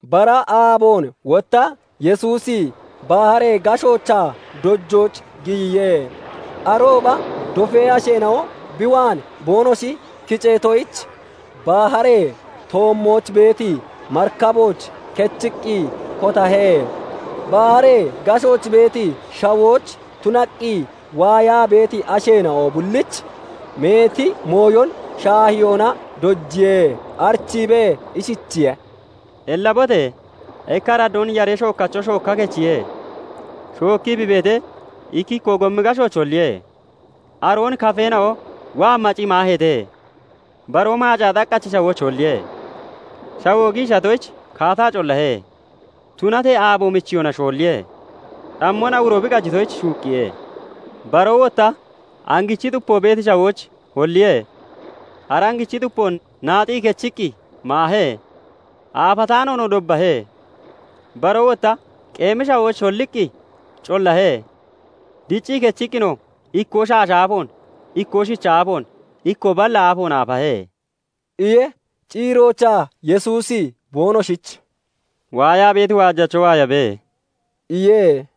Bara aaboon wotta Yesuusi baharee gashoochaa dojooch giyiye. Arooba dofee asheena'o bi waan boonoshi kiceetoyich, baharee toommooch beeti marikabooch kechiqqi kotahe. Baharee gashooch beeti shawooch tunaqqi waayaa beeti asheena'o bullich meeti mooyon shaahiyoona dojiye. Arichiibee ishichiye:- "Ellabote! Ikka araddoon yaree shookacho shooka kechiye. Shookii bi beetee, ikkikkoo gomi gashooch holliye; aroon kafeen'o waa maciqqi maaheete. Baroo maacaa xaqachi shawooch holliye; shawoo giishatoyich kaataa collahe; Tunatee aabo michiyona shoolliye; cammon awuro bi qajitoyich shuuqqiye. Baroo wotta angichi xupo beeti shawooch holliye; ara angichi xupoo naaxii kechiqqi (nochiqqi) maahee; aafataanoonoo dobbahe. Baroo wotta qeemi shawooch holliqqi collahe; diccii kechiqqinoo, ikkoo shaasha aafoon, ikkoo shicha aafoon, ikkoo balla aafoon aafahe" iye. Ciiroochaa Yesuusi boonoshich "Waayaa beeti waajacho waayabe!" iye.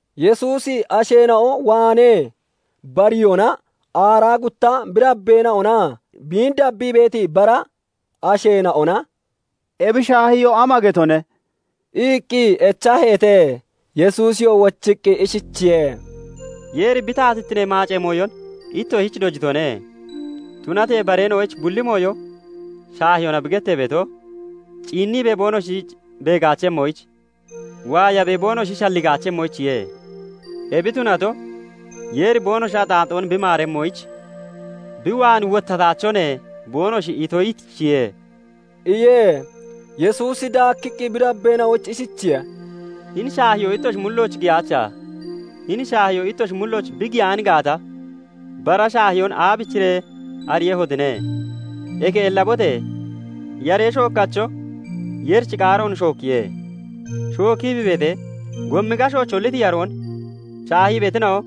Yesuusi asheena'o waanee bariyona aaraa gutta bi dabbeena'onaa biin dabbii beeti bara ' asheena'ona "Ebi shaahiyoo ama getone?" iqqi echaheete. Yesuusiyoo wochiqqi ishichiye:- "Yeeri bi taatittinee maacee mooyon ittoshich dojitone; tunatee bareena'oyich bulli mooyo shaahiyoona bi gettee beeto, 'Ciinibee boonoshi beegaachemmoyich, waayabee boonoshi shalligaachemmoyichiye. ebi tunato, Yeer boonoshi axaaxoon bi maaremmoyich, bi waan wottataachone boonoshi itoyichiye' "iye. Yesuusi daakkiqqi bi dabbeena'oyich ishichiye:- "Hini shaahiyoo ittoshi mullooch giyaacha? Hini shaahiyoo ittoshi mullooch bi giyaan gaata, bara shaahiyoon aabichiree ariiyehotine? Eke ellabote! Yaree shookkacho Yeerichi qaaroon shookkiye. Shookkii bi beetee, gomi gashooch holliti yaroon shaahii beetina'o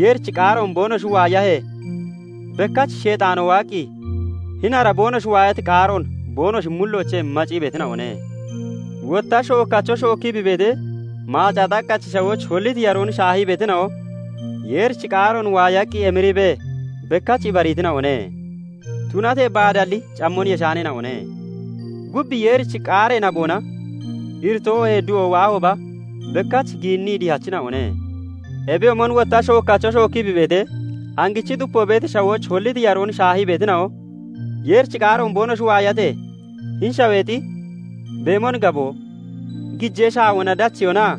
Yeerichi qaaroon boonoshi waayahee, bekkach Sheexaano waaqqi hini ara boonoshi waayati qaaroon boonoshi mulloochee macii beetina'one. Wotta shookacho shookii bi beetee, maacaa xaqqachi shawooch holliti yaroon shaahii beetina'o Yeerichi qaaroon waayaqqi emiriibee bekkach ibariitina'one; Tunatee baadalli cammon yeshaaneena'one; gub Yeerichi qaaree naboona iritoo oohee du'o waahooba bekkach giinnii dihachina'one. Ebiyoomon wotta shookkacho shookkii bi beetee, angichi xupo beeti shawooch holliti yaroon shaahii beetina'o Yeerichi qaaroon boonoshi waayatee, hini shaweexi beemon gaboo, gijee shaawona dacheyonaa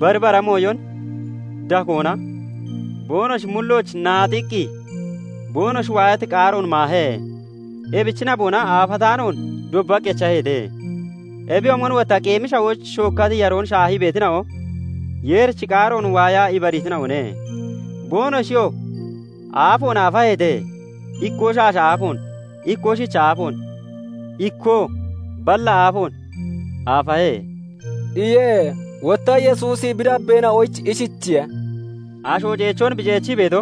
bari bara mooyon dakoona boonoshi mullooch naaxiqqi boonoshi waayati qaaroon maahe. Ebichi naboona aafataanoon dobbaqii echaheete. Ebiyoomon wotta qeemi shawooch shookkati yaroon shaahii beetina'o Yeerichi qaaroon waayaa ibariitina'one. Boonoshiyoo aafoon aafaheete; ikkoo shaasha aafoon, ikkoo shicha aafoon, ikkoo balla aafoon aafahe" iye. Wotta Yesuusi bi dabbeena'oyich ishichiye:- "Asho ceechoon bi ceechi beeto,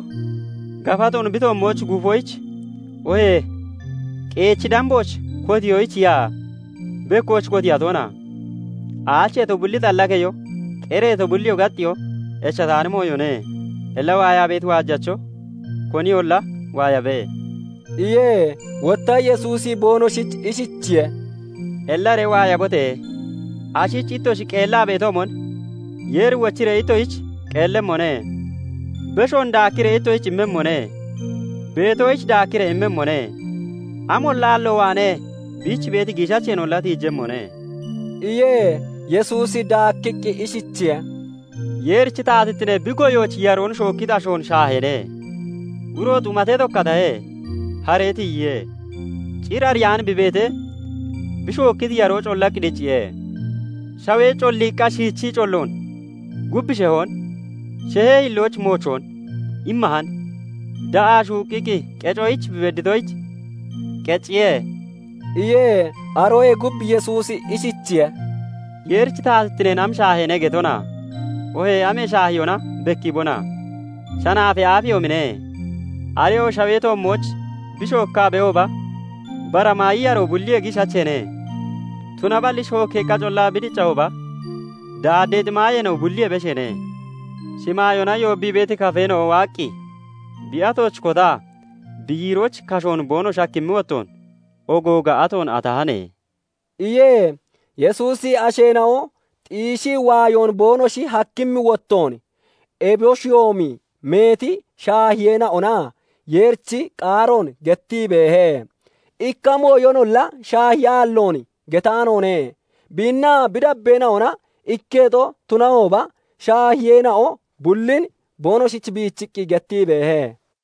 gafatoon bi toommooch guufoyich oohee qeechi dambooch kotiyoyichiya? Bekkooch kotiiya toona? Aacheeto bulli xalla keyo, qereeto bulliyoo gaxxeyoo echataani mooyone. Illa waayaa beeti waajacho koniyolla waayabe" iye. Wotta Yesuusi boonoshich ishichiye:- "Ellaree waayabote! Ashich ittoshi qeellaa (shafarii) beetoomon Yeeri wochiree ittoshich qeellemmone; beshoon daakkiree ittoshich immemmone. Beetoyich daakkiree immemmone; amolla aallo waanee biich beeti giishacheenolla tiijemmone" iye. Yesuusi daakkiqqi ishichiye:- "Yeerichi taatittine bi goyooch yaroon shookkiti ashoon shaaheene. Uro xumatee tokkatahe; haree tiyiye. Cir ariyaan bi beetee, bi shookkiti yaroo collaqqi dicciye. Shawee colliiqqa shiichii colloon, gub shehoon, shehee hillooch moochoon immahan. Da'aa shuuqqiqqi qecoyich bi bedditoyich qecciye" iye. Aroyee gub Yesuusi ishichiye:- "Yeerichi taatittine am shaaheene getona? Oohee amee shaahiyoona bekkiibona? Shanaafee aafeyoomine. Areyo shawee toommooch bi shookkaa beehooba, bara maayi yaroo bulliyee giishacheene. Tunaballi shookkeeqqa collaa bi diccahooba daaddeexi maayeena'o bulliyee besheene. Shimaayoona yoobbii beeti kafeena'o waaqqi bi atooch kotaa bi yiirooch kashoon boonoshi hakkimmi wottoon ogooga atoon atahane" iye. Yesuusi asheena'o xiishii waayoon boonoshi hakkimmi wottoon eboshiyoomi meeti shaahiyeena'ona Yeerichi qaaroon gettii beehe. Ikka mooyonolla shaahiyaalloon getaanoone. Biinnaa bi dabbeena'ona ikketo tunahooba, shaahiyeena'o bullin boonoshich biichiqqi gettii beehe.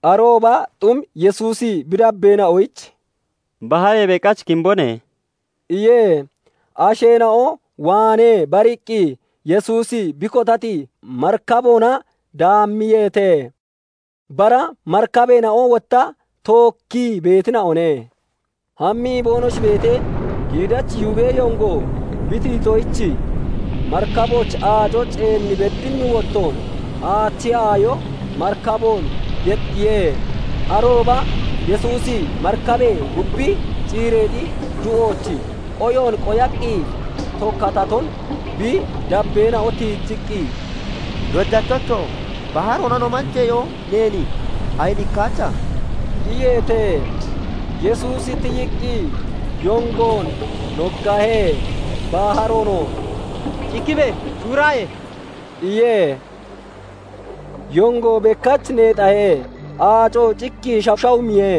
Arooba xum Yesuusi bi dabbeena'oyich "Baharee beqach kimbone" iye. Asheena'o waanee bariqqi Yesuusin bi kotati marikaboona daammiyeete. Bara marikabeena'o wotta tookkii beetina'one. Hammii boonoshi beetee, giidachi yubee yongo bi tiyitoyich marikabooch aaco ceen beddimmi wottoon aachi aayo marikaboon yexxiye. Arooba Yesuusi marikabee gubbi ciireexi du'ooch qoyoon qoyaqqi tokkataton bi dabbeena'o tiijiqqi, "Dojachocho! Baharoona no manjeyo neen ayinikkaacha?" iyeete. Yesuusi tiyiqqi yongoon nooggahe; baharoonoo "Cikkibe! Shuuraaye!" iye. Yongoo bekkach neexahe; aacoo cikkii shashawumiye.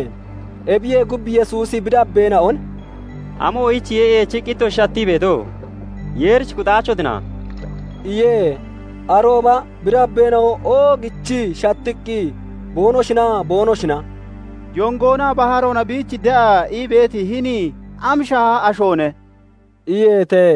Ebiyee gub, Yesuusi bi dabbeena'on "Amoyichiye eechiqqi ittoshi shattii beeto? Yeerich kuxaachotina?" iye. Arooba bi dabbeena'o oogichii shattiqqi boonoshinaa boonoshina "Yongoonaa baharoona biich de'a ii beeti hini am shaaha ashoone?" iyeete.